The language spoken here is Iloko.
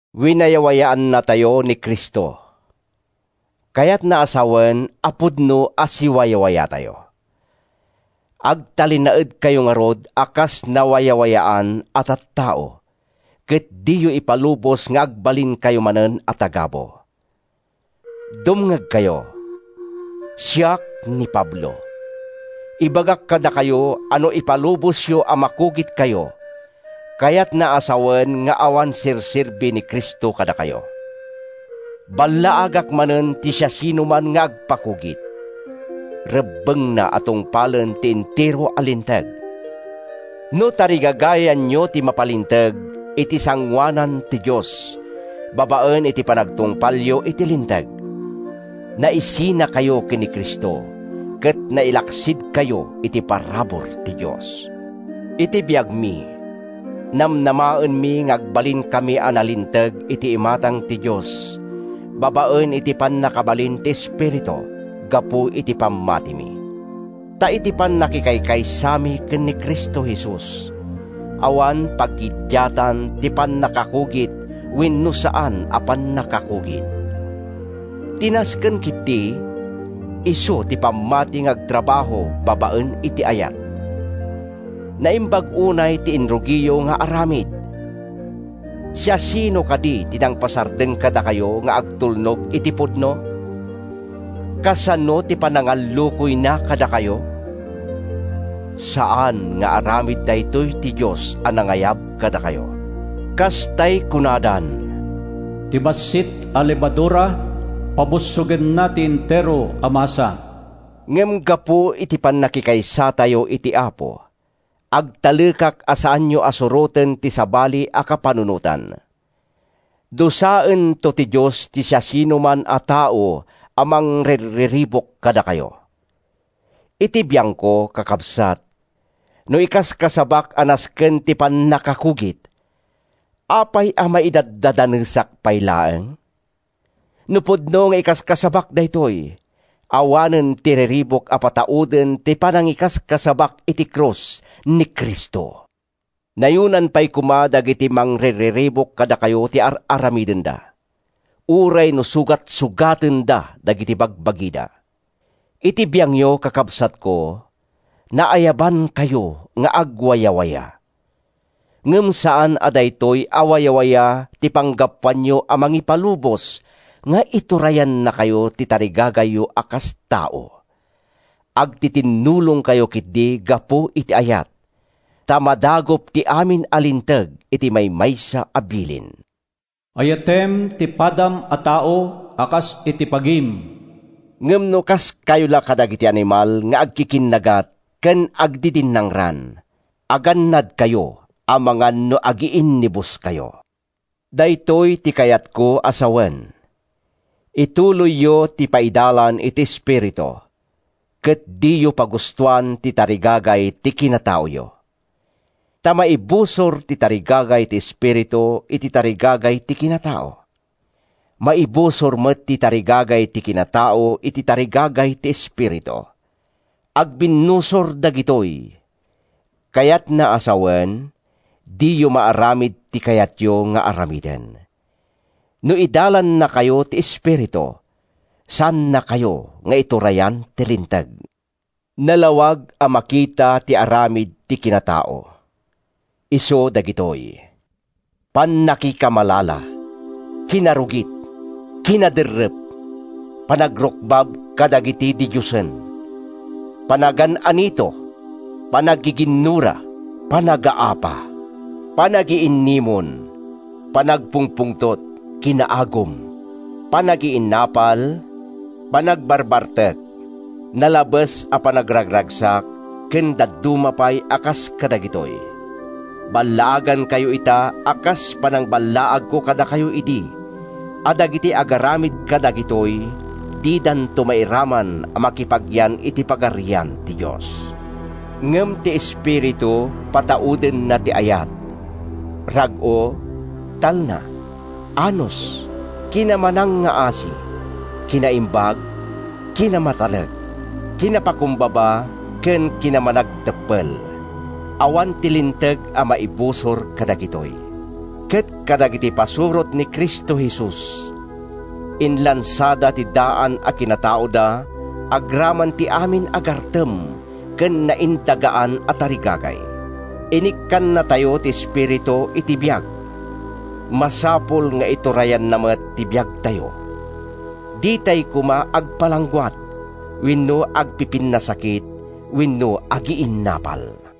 Winayawayaannatayo ni Cristo! Kayatna a sawen a pudno a siwawayatayo. Agtalinaedkayo ngarud a kas nawayawayaan a tattao, ket diyo ipalubos nga agbalinkayo manen a tagabu. Dumngegkayo. Siak ni Pablo. Ibagak kadakayo a no ipalubosyo a makugitkayo, kayatna a sawen nga awan serserbi ni Cristo kadakayo. Ballaagak manen ti siasinoman nga agpakugit: rebbengna a tungpalen ti entero a Linteg. No tarigagayanyo ti mapalinteg iti sangoanan ti Dios babaen iti panagtungpalyo iti Linteg, naisinakayo ken ni Cristo ket nailaksidkayo iti parabur ti Dios. Iti biangmi, namnamaenmi nga agbalinkami a nalinteg iti imatang ti Dios babaen iti pannakabalin ti Espiritu gapu iti pammatimi. Ta iti pannakikaysami ken ni Cristo Jesus, awan paggiddiatan ti pannakakugit wenno saan a pannakakugit. Ti nasken ketdi, isu ti pammati nga agtrabaho babaen iti ayat. Naimbag unay ti inrugiyo nga aramid! Siasino kadi ti nangpasardeng kadakayo nga agtulnog iti pudno? Kasano ti panangallukoyna kadakayo? Saan nga aramid daytoy ti Dios a nangayab kadakayo. Kas tay kunadan, “Ti bassit a lebadura, pabussogenna ti entero a masa.” Ngem gapu iti pannakikaysatayo iti Apo, agtalekak a saanyo a suroten ti sabali a kapanunotan. Dusaento ti Dios ti siasinoman a tao a mangrirriribuk kadakayo. Iti biangko, kakabsat, no ikaskasabak a nasken ti pannakakugit, apay a maidaddadanesak pay laeng? No pudno nga ikaskasabak daytoy, awanen ti riribuk a patauden ti panangikaskasabak iti krus ni Cristo. Nayonan pay koma dagiti mangrirriribuk kadakayo ti ar-aramidenda, uray no sugatsugatenda dagiti bagbagida! Iti biangyo, kakabsatko, naayabankayo nga agwayawaya. Ngem saan a daytoy a wayawaya ti panggapuanyo a mangipalubos nga iturayannakayo ti tarigagayyo a kas tao. Agtitinnulongkayo ketdi gapu iti ayat. Ta madagup ti amin a Linteg iti maymaysa a bilin: “Ayatem ti padam a tao a kas iti bagim.” Ngem no kaskayo la kadagiti animal nga agkikinnagat ken agdidinnangran, agannadkayo amangan no agiinnibuskayo. Daytoy ti kayatko a sawen: ituloyyo ti paidalan iti Espiritu, ket diyo pagustoan ti tarigagay ti kinataoyo. Ta maibusor ti tarigagay ti Espiritu iti tarigagay ti kinatao. Maibusor met ti tarigagay ti kinatao iti tarigagay ti Espiritu. Agbinnusor dagitoy, kayatna a sawen, diyo maaramid ti kayatyo nga aramiden. No idalannakayo ti Espiritu, saannakayo nga iturayan ti Linteg. Nalawag a makita ti aramid ti kinatao. Isuda dagitoy: pannakikamalala, kinarugit, kinaderrep, panagrukbab kadagiti didiosen, panagan-anito, panaggiginnura, panagaapa, panagiinnimon, panagpungpungtot, kinaagum, panagiinnapal, panagbarbartek, nalabes a panagragragsak ken dadduma pay a kas kadagitoy. Ballaagankayo ita a kas panangballaagko kadakayo idi a dagiti agaramid kadagitoy didanto mairaman a makipagyan iti Pagarian ti Dios. Ngem ti Espiritu pataudenna ti ayat, rag-o, talna, anus, kinamanangngaasi, kinaimbag, kinamatalek, kinapakumbaba ken kinamanagteppel. Awan ti linteg a maibusor kadagitoy. Ket dagiti pasurot ni Cristo Jesus, inlansada ti daan a kinataoda agraman ti amin a gartem ken naindagaan a tarigagay. Inikkannatayo ti Espiritu iti biag; masapul nga iturayanna met ti biagtayo. Ditay koma agpalangguad, wenno agpipinnasakit wenno agiinnapal.